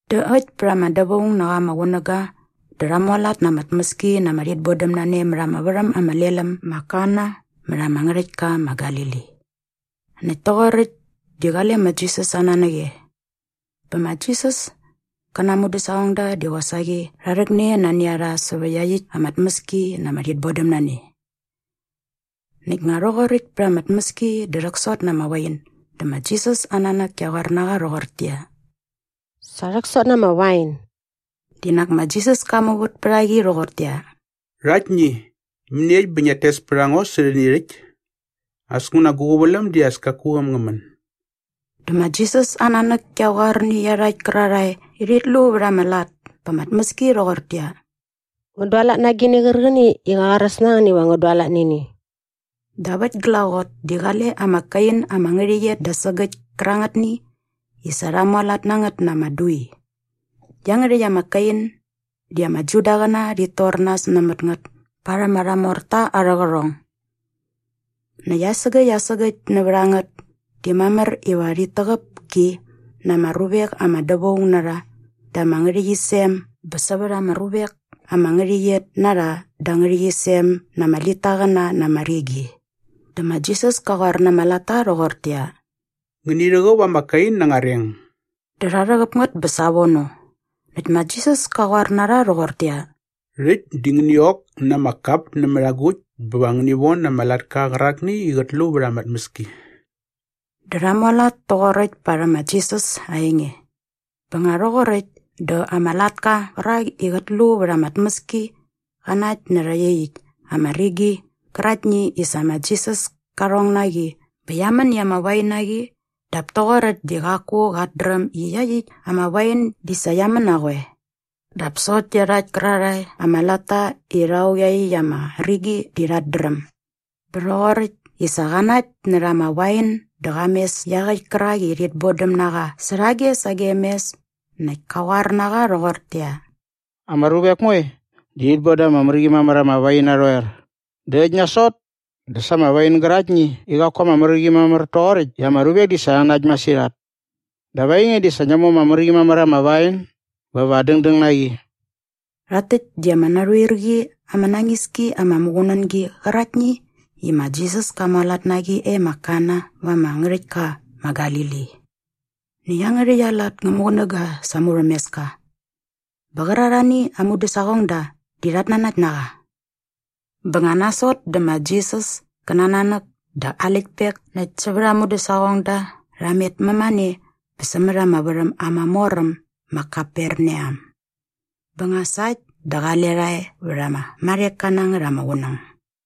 Dä äkt pät ama dävaung na qa ama qunäga dä rha mualat na ama tmäski na ama rhitbodämnane mät ama värhäm ama lel äm ma Kana mät ama ngärhäktka ma Galili. Näkt toqoräkt di qale ma Jisas aa nanäk e. Bä ma Jisas kä na aa mudäsaqongda di qosaqi rha rhäkne nani a rha sävä iaqyäkt ama tmäski na ama rhitbodämnane. Näkt nga rhoqoräkt pa ama tmäski dä rhäksot na ama wain dä ma Jisas aa nanäk kia qoar na qa rhoqortäqyia, “Sa rhäksot na ama wain.” Di nak ma Jisas ka muvät pät a qi rhoqortäqyia, “Rhaktni, mäniekt bä ngiat tes pät a ngo sä rhäni rhäkt? As nguna gu qäväläm di as kaku äm ngä män.” Dä ma Jisas aa nanäk kia qoar nä iarhakt kärarhae i rhit lu vät ama lat pa ama tmäski rhoqortäqyia, “Ngän dualat na agini qärqäni i qä qoaräs na ngän iva ngän dualat nä ini.” Dap äkt glaqot di qale ama kain ama ngärhäqyet da sägäkt kärangätni i sa rha mualat na ngät na ama dui. Iangärhäkt ama kain di ama Judaqäna rhit tor nas nämät ngät parhäm arha morta arhä qärhong. Näkt asägäkt asägäkt nävät a ngät di mamär iva rhit täqäp ki na ama ruvek ama dävaung na rha da ama ngärhäqyisem bä sävät ama ruvek ama ngärhäqyet na rha da ama ngärhäqyisem na ama litaqäna na ama rigi. Dä ma Jisas ka qoar na ama latta rhoqortäqyia, “Ngäni rhäqäp ama kain na anga reng.” Dä rha rhäqäp ngät bä savono. Näkt ma Jisas ka qoar na rha rhoqortäqyia, “Rhäkt di ngäni ok na ama kap nämät agukt bä va ngäni von ama latka qärakni i qät lu vät ama tmäski.” Dä rha mualat toqoräkt parhäm ma Jisas aa enge bä nga rhoqoräkt dä ama latka qärak i qät lu vät ama tmäski qa nakt närhä iaqyäkt ama rigi qäraktni i sa ma Jisas ka rhong na qi bä qia män i ama wain na qi dap toqoräkt di qaku qat dräm i iaqyäkt ama wain di sa qia män na qoe. Dap sokt iarhakt kärarhae ama latta i rha ok iaqyäkt ama rigi di rhat dräm. Bä rhoqoräkt i sa qa nakt närha ama wain dä qa mes iaqäkt kärak i rhit bodäm na qa särhage sagem mes näkt ka qoar na qa rhoqortäqyia, “Ama ruvek moe di rhit bon da ama mär qi mamär ama wain narhoer dä äkt nasot dä sa ama wain gäraktni i qaku ama mär qi mamär toqoräkt i ama ruvek di sa rha nakt masirhat. Dap ainge di nak sa ngia mu ama mär qi mamär ama wain bä va dängdäng na qi.” Rhakt täkt di ama narhuir qi ama nañis ki ama muqunängi qäraktni i ma Jisas ka mualat na qi e ma Kana va ama ngärhäktka ma Galili. Näkt iangärhäkt aa lat ngä muqunäga sa aa murhämeska. Bä qärarhani aa mudäsaqongda di rhat nanakt na qa. Bä nga nasot dä ma Jisas kä na aa nanäk dä aa läktpek näkt sävät aa mudäsaqongda rha met mämane bä sämät ama värhäm ama mor äm ma Kaperneam. Bä nga sa äkt dä qale rha e vät ama marheka na ngät ama qunäng.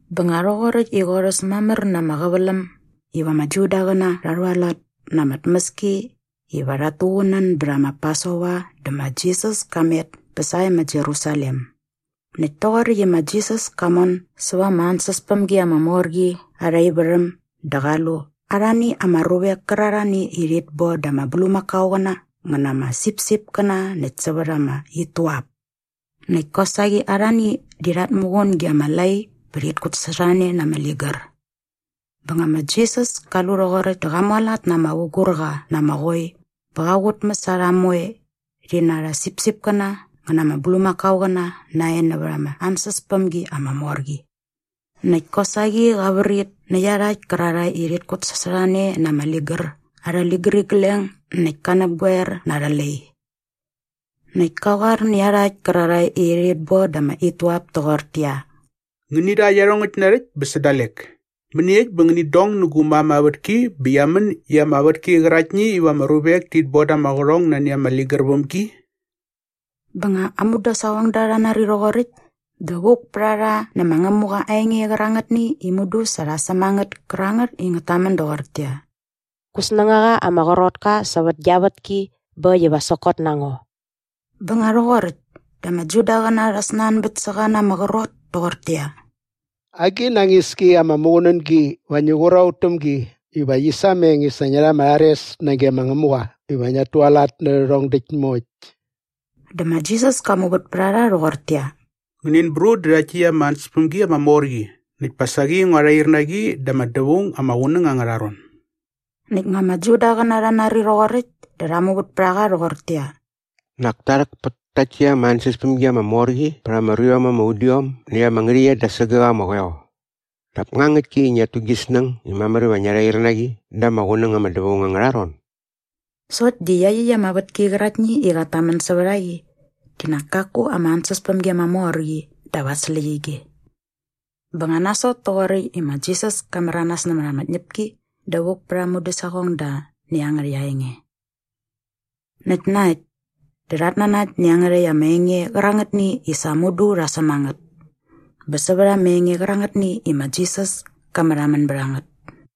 Bä nga rhoqoräkt i qorhäs mamär na ama qäväläm iva ama Judaqäna rha rhualat na ama tmäski iva rhat tuqunän bät ma Pasova dä ma Jisas ka met bä sae ma Jerusalem. Näkt toqoräkt i ma Jisas ka mon säva ama ansäspämgi ama mor qi arha ivärhäm dä qa lu arhani ama ruvek kärarhani i rhit boda ama bulmakaoqäna ngä na ama sipsipkäna näkt sävät ama ituap. Näkt kosaqi arhani di rhat muqun ge ama lai bä rhit kutsasorhane na ama ligär. Bä nga ma Jisas ka lu rhoqoräkt dä qa mualat na ama vugurqa na ama qoi bä qa qutmäs a rha moe rhi na arhä sipsipkäna ngä na ama bulmakaoqäna nae näva ama ansäspämgi ama mor qi. Näkt kosaqi qa vrit nä iarhakt kärarhae i rhit kutsasorhane na ama ligär arhä ligärigleng näkt ka näpgoer na arhä lai. Näkt ka qoar nä iarhakt kärarhae i rhit boda ama ituap toqortäqyia, “Ngäni rha iarhongäkt narhäkt bä sä dalek! Mäniekt bä ngänit dong nä gu mam aa vätki bä qia män i ama vätki qäraktni iva ama ruvek tit boda ama qärhong nani ama ligär väm gi.” Bä nga aa mudäsaqongda rha nari rhoqoräkt dä vuk pät a rha nä ma Ngämuqa aa enge qärangätni i mudu sa rha säm a ngät kärangät i ngät tamän doqortäqyia, “Gu snängaqa ama qrot ka sävät gia vätki bä äkt iva sokot na ngo.” Bä nga rhoqoräkt dä ama Judaqäna rha snanbät sä qa na ama qrot toqortäqyia, “Agi nañis ki ama muqunängi va ngi qur a ut täm gi iva qi sameng i sa ngia rha ama rhares nage ma Ngämuqa iva ngiat tualat nä rhärhong däkt moekt?” Dä ma Jisas ka muvät pät a rha rhoqortäqyia, “Ngänin brut dä rhakt täkt ama ansäspämgi ama mor qi näkt pa saqi ngua rhair na qi da ama qunäng ama dävaung angärha ron.” Näkt nga ama Judaqäna rha nari rhoqoräkt dä rha muvät pät a qa rhoqortäqyia, “Nak ta rhäk pät takt täkt ama ansäspämgi ama mor qi vät ama ruiom ama udiom näkt ama ngärhäqyet da sägäk ama qoeo. Dap nga ngäktki i ngiat tu gi snäng i mamär iva ngia rhair na qi da ama qunäng ama dävaung angärha ron?” Sokt di iaqyäkt ama vätki qäraktni i qat tamän sävät a qi di nak kaku ama ansäspämgi ama mor qi dap aa släqyige. Bä nga nasot toqoräkt i ma Jisas ka märanas nämät ama tñäpki dä vuk pät aa mudäsaqongda nä iangärhäkt aa enge. Näkt na äkt dä rhat nanakt nä iangärhäkt ama enge qärangätni i sa mudu rha säm a ngät bä sävät ama enge qärangätni i ma Jisas ka märhamän bät a ngät.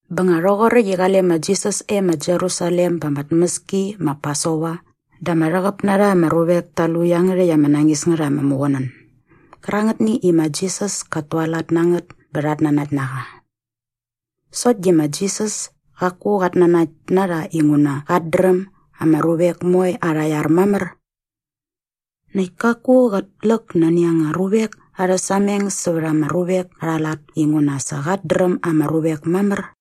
Bä nga rhoqoräkt i qale ma Jisas e ma Jerusalem ba ama tmäski ma Pasova dä ama rhäqäp na rha ama ruvek ta lu iangärhäkt ama nañis ngät ama muqunän gärangätni i ma Jisas kat tualat na ngät bä rhat nanakt na qa. Sokt di ma Jisas kaku qat nanakt na rha inguna qat dräm ama ruvek moe arha iar mamär. Näkt kaku qät läk nani anga ruvek arhä sameng sävät ama ruvek arha lat inguna sa qat dräm ama ruvek mamär.